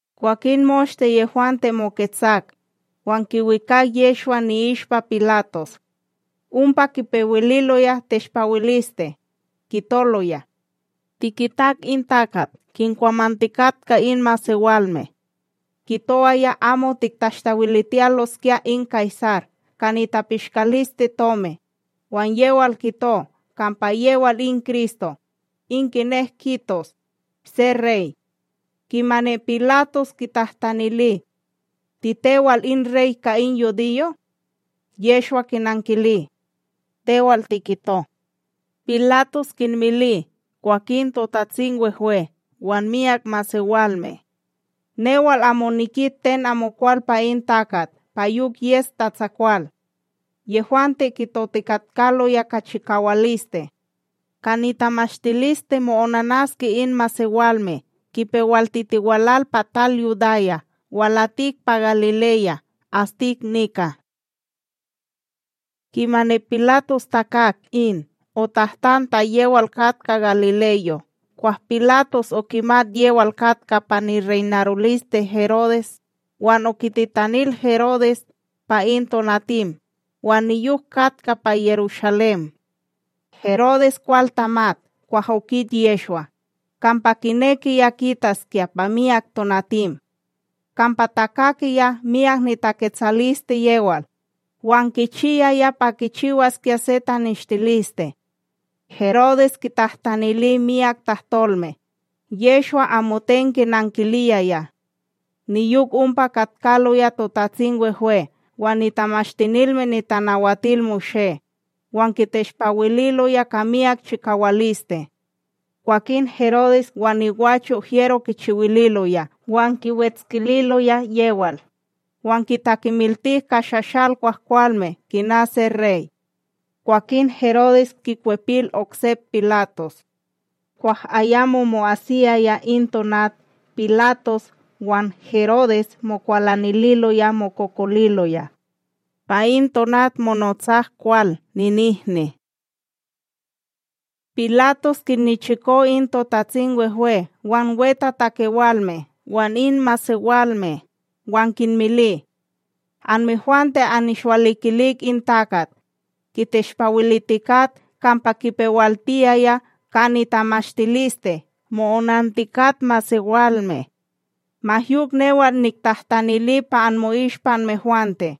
Kwakin moshte yehwante moketsak, wan kiwikak Yehshwa ni'ishpa Pilatos. Ompa kipewililoya teshpawiliste, kitoloya: ―Tikitak in takat kinkwamantikatka in masewalme. Kitowaya amo tiktashtawilitiyaloskya in Kaysar ka nitapishkalisteTomi, wan yewal kito kampa yewal in Kristo, in kinek kitos, se Rey. Kimani Pilatos kitahtanili: ―Titewal in Rey ka in yudiyo'? Yehshwa kinankili: ―Tewal tikito. Pilatos kinmili kwakin TotatsimWehwe wan myak masewalme: ―Newal amo nikit ten amokwal pa in takat pa yok yes tatsakwal. Yehwante kitotikatkaloya ka chikawaliste: ―Ka nitamashtiliste mo'onanaske in masewalme kipewaltitiwal pa tal Yudaya walatik pa Galileya, astik nika. Kimani Pilatos takak in, otahtan ta yewal katka galileyo. Kwah Pilatos okimat yewal katka pa nireynaroliste Herodes, wan okititanil Herodes pa in tonatim wan niyok katka pa Yerushalém. Herodes kwal tamat kwah okit Yehshwa, kampa kinekiya kitaskya pa miyak tonatim; kampa takakiya myak nitaketsaliste yewal, wan kichiyaya pa kichiwaskya se taneshtiliste. Herodes kitahtanili myak tahtolme, Yehshwa amoten kinankiliyaya. Niyok ompa katkaloya TotatsimWehwe wan Tamashtinilme NitanawatilMoshé, wan kiteshpawililoya ka miyak chikawaliste. Kwakin Herodes wan nigwacho' hyero kichiwililoya wan kiwetskililoya yewal, wan kitakemiltik ka shashal kwahkwalme kina se Rey. Kwakin Herodes kikwepil oksep Pilatos. Kwah ayamo mo'asiyaya in tonat Pilatos wan Herodes mokwalanililoya mokokoliloya; pa in tonat monotsak kwal ninihni. Pilatos kinnichiko in TotatsimWehwe wan wetatakewalme wan in masewalme, wan kinmili: ―Anmehwante annishwalikilik in takat, kiteshpawilitikat kampa kipewaltiyaya ka nitamashtiliste mo'onantikat masewalme; ma yok newal niktahtanili pa anmo'ishpa anmehwante,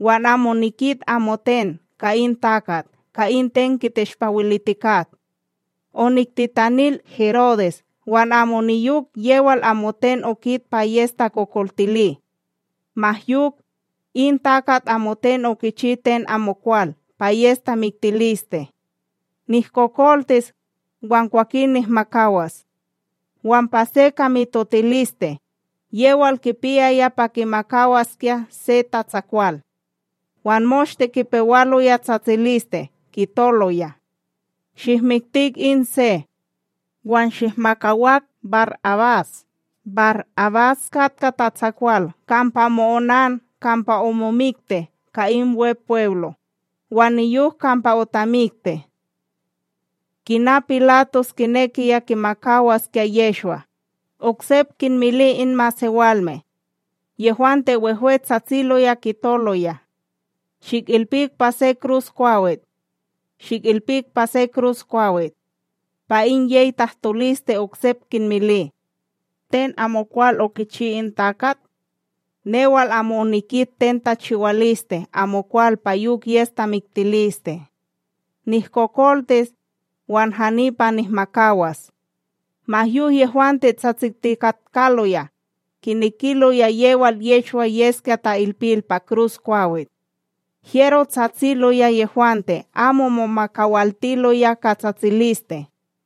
wan amo nikit amoten ka in takat ka in ten kiteshpawilitikat. Oniktitanil Herodes wan amo niyok yewal amoten okit pa yes takokoltili. Ma yok, in takat amoten okichi ten amokwal pa yes tamiktiliste. Nihkokoltis, wan kwakin nihmakawas. Wan pa se ka mitotiliste, yewal kipiyaya pa kimakawaskya se tatsakwal. Wan moshte kipewaloya tsatsiliste kitoloya: ―Shikmikti in se! wan shihmakawak BarAbas! BarAbas katka tatsakwal kampa omo'onan kampa omomikti ka in Wepweblo, wan niyok kampa otamikti. Kina Pilatos kinekiya kimakawaskya Yehshwa, oksep kinmili in masewalme; yehwante wehwe tsatsiloya kitoloya: ―Shikilpik pa se kruskwawit! Shikilpik pa se kruskwawit! Pa in yey tahtoliste oksep kinmili: ―Ten amokwal okichi in takat? Newal amo onikit ten tachiwaliste amokwal pa yok yes tamiktiliste. Nihkokoltis, wan hani pa nihmakawas. Ma yok yehwante tsatsitikatkaloya, kinekiloya yewal Yehshwa yeskya ta'ilpil pa kruskwawit; Hyero tsatsiloya yehwante amo momakawaltiloya ka tsatsiliste.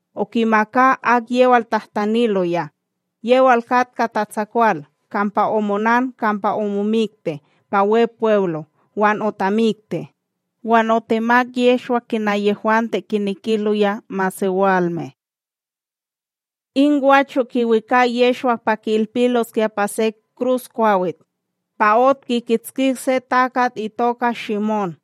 okimaka akyewal tahtaniloya, yewal katka tatsakwal kampa omo'onan kampa omomikti pa Wepweblo wan otamikti, wan otemak Yehshwa kina yehwante kinekiloya masewalme. In gwacho kiwikak Yehshwa pa ki'ilpiloskya pa se kruskwawit, pa ot kikitskik se takat itoka Shimón,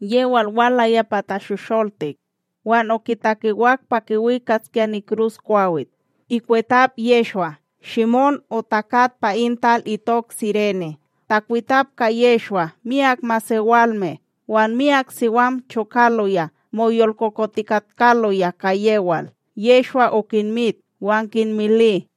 yewal walaya pa tashosholtik wan okitakewak pa kiwikaskya nikruskwawit ikwetap Yehshwa, Shimón otakat pa in tal itok Sirene. Takwitap ka Yehshwa myak masewalme, wan myak siwam chokaloya moyolkokotikatkaloya ka yewal. Yehshwa okinmit wan kinmili: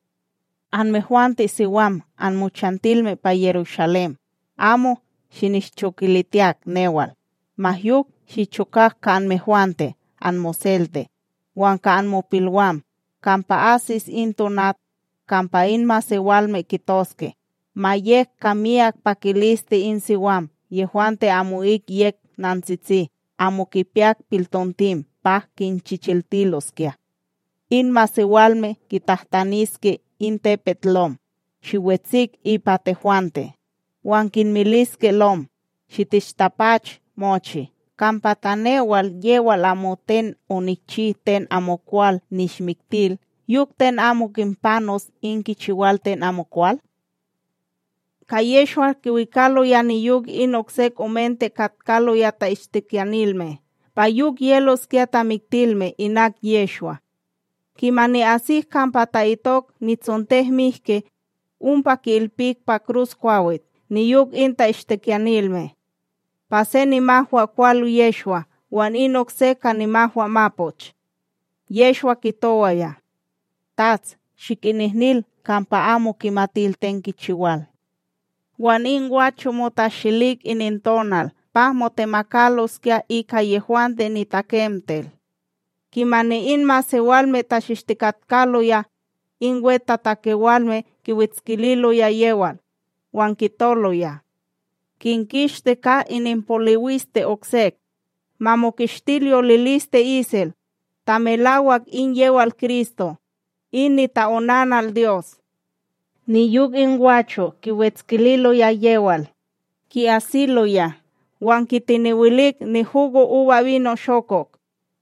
―Anmehwante siwam anmochantilme pa Yerushalém, amo shinishchokilitiyak newal, ma yok shichokak ka anmehwante anmoselte wan ka anmopilwam. Kampa asis in tonat kampa in masewalme kitoske: “Ma yek ka miyak pakiliste in siwam yehwante amo'ik yek nantsisti amo kipiyak piltontim pa kinchichiltiloskya.” In masewalme kitahtaniske in tepetLom: “Shiwetsik ipa tehwante”; wan kinmiliske lom: “Shitishtapach mochi.” Kampa ta newal yewal amoten onikchi ten amokwal nishmiktil, yok ten amo kinpanos in kichiwal ten amokwal? Ka Yehshwa kiwikaloya niyok in oksek omente katkaloya ta'ishtikiyanilme pa yok yeloskya tamiktilme inak Yehshwa. Kimani asik kampa ta'itok NitsontekMihki,a ompa ki'ilpik pa kruskwawit niyok in ta'ishtikiyanilme: se pa nimahwakwal Yehshwa wan in okse ka nimahwamapoch. Yehshwa kitowaya: ―Tats, shikinihnil, kampa amo kimatil ten kichiwal. Wan in gwacho' motashilik inintonal pa motemakaloskya ika yehwante nitakemtel. Kimani in masewalme tachishtikatkaloya, in wetatakewalme kiwetskililoya yewal, wan kitoloya: ―Kinkishti ka ininpoliwiste oksek, ma mokishtil yoliliste isel, ta melawak in yewal Kristo, in nita'onanal Dyos. Niyok in gwacho' kiwetskililoya yewal, ki'asiloya wan kitenewilik nihugoUbaShokok,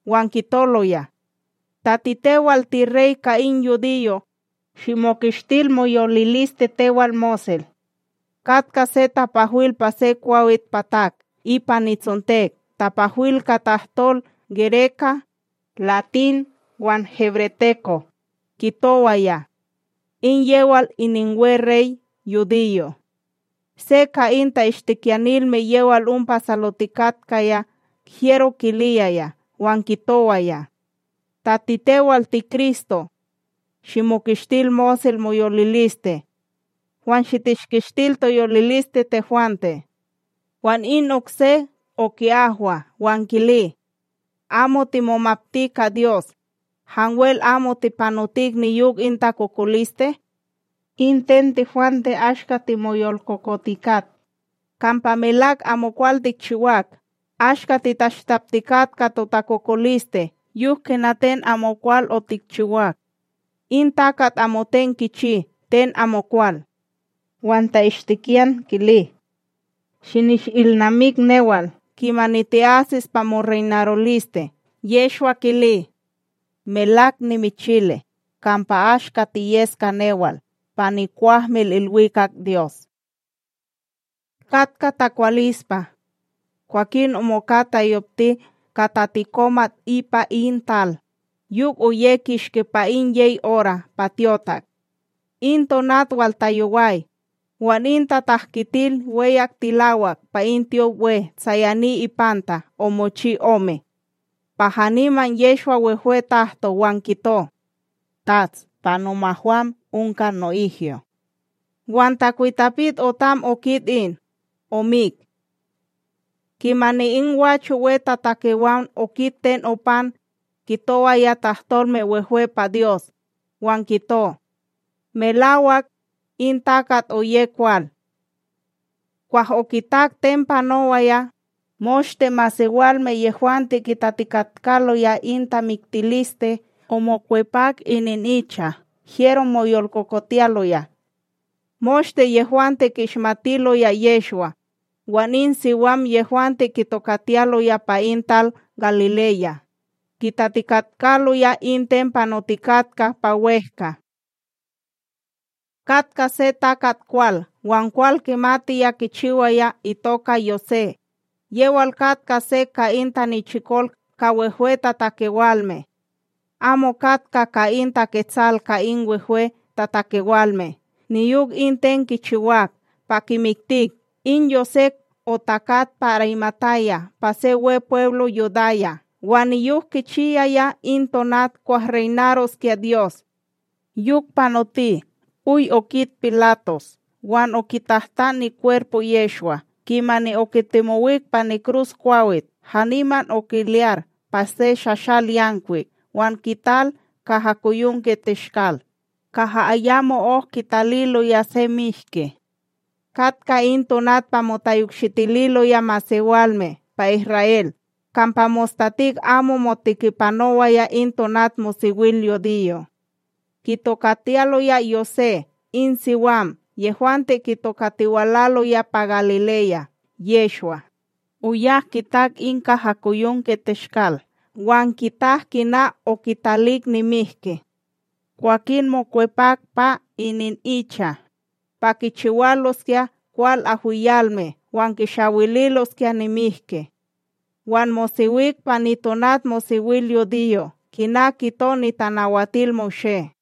wan kitoloya: ―Ta titewal tirey ka in yudiyo', shimokishtil moyoliliste tewal mosel. Katka se tapahwil pa se kwawitPatak ipa nitsontek tapahwil ka tahtol gereka, latin wan hebreteko, kitowaya: “IN YEWAL ININWEREYYUDIYO'.” Se ka in ta'ishtikiyanilme yewal ompa salotikatkaya hyero kiliyaya wan kitowaya: ―Ta titewal tiKristo, shimokishtil mosel moyoliliste, wan shitishkishtil toyoliliste tehwante. Wan in okse oki'ahwa wan kili: ―Amo timomapti ka Dyos, hanwel amo tipanotik niyok in takokoliste? In ten tehwante ashka timoyolkokotikat, kampa melak amokwal tikchiwak ashka titashtaptikat ka takokoliste yok kina ten amokwal otikchiwak; in takat amoten kichi ten amokwal. Wan ta'ishtikiyan kili: ―Shinishilnamik newal kimani ti'asis pa moreynaroliste. Yehshwa kili: ―Melak nimichili, kampa ashka tiyes ka newal pa nikwahmilIlwikak Dyos. Katka takwalispa. Kwakin omoka tayopti ka tatikomat ipa in tal, yok oye kishki pa in yey ora pa tyotak. In tonat waltayoway, wan in tatahkitil weyak tilawak pa in tyopWe tsayani ipanta omochi ome. Pa haniman Yehshwa wehwe tahto wan kito: ―Tats, pa momahwam onka no'ihyo. Wan takwitapik otam okit in, omik. Kimani in gwacho wetatakewan okit ten opan, kitowaya tahtolme wehwe pa Dyos, wan kito: ―Melawak, in takat oye kwal. Kwah okitak ten panowaya, moshte masewalme yehwante kitatikatkaloya in tamiktiliste, omokwepak ininicha hyero moyolkokotiyaloya. Moshte yehwante ki'ishmatiloya Yehshwa, wan in siwam yehwante kitokatiyaloya pa in tal Galileya, kitatikatkaloya in ten panotikatka pa wEhka. Katka se takat kwal wan kwal kimatiya kichiwaya itoka Yosé, yewal katka se ka in tanichikol ka wehwetatakewalme. Amo katka ka in taketsal ka in wehwetatakewalme niyok in ten kichiwak pa kimiktik, in Yosé otakat pa Arimataya pa se Wepweblo Yudaya wan niyok kichiyaya in tonat kwah reynaroskya Dyos. Yok panoti oy okit Pilatos wan okitahtan nikwerpo Yehshwa. Kimani okitemowik pa nikruskwawit, haniman okilyar pa se shahsal yankwik wan kital kahakoyonkeTeshkal, kaha ayamo'ok kitaliloya se mihki. Katka in tonat pa motayokshitililoya masewalme pa Isra'El kampa mostatik amo motikipanowaya in tonatmosewilyudiyo. Kitokatiyaloya Yosé in siwam yehwante kitokatiwalaloya pa Galileya Yehshwa, oyak kitak in kahakoyonkeTeshkal wan kitak kina okitalik nimihki. Kwakin mokwepak pa ininicha, pa kichiwaloskya kwal ahwiyalme wan kishawililoskya nimihki, wan mosewik pa nitonatmosewilyudiyo, kina kito NitanawatilMoshé.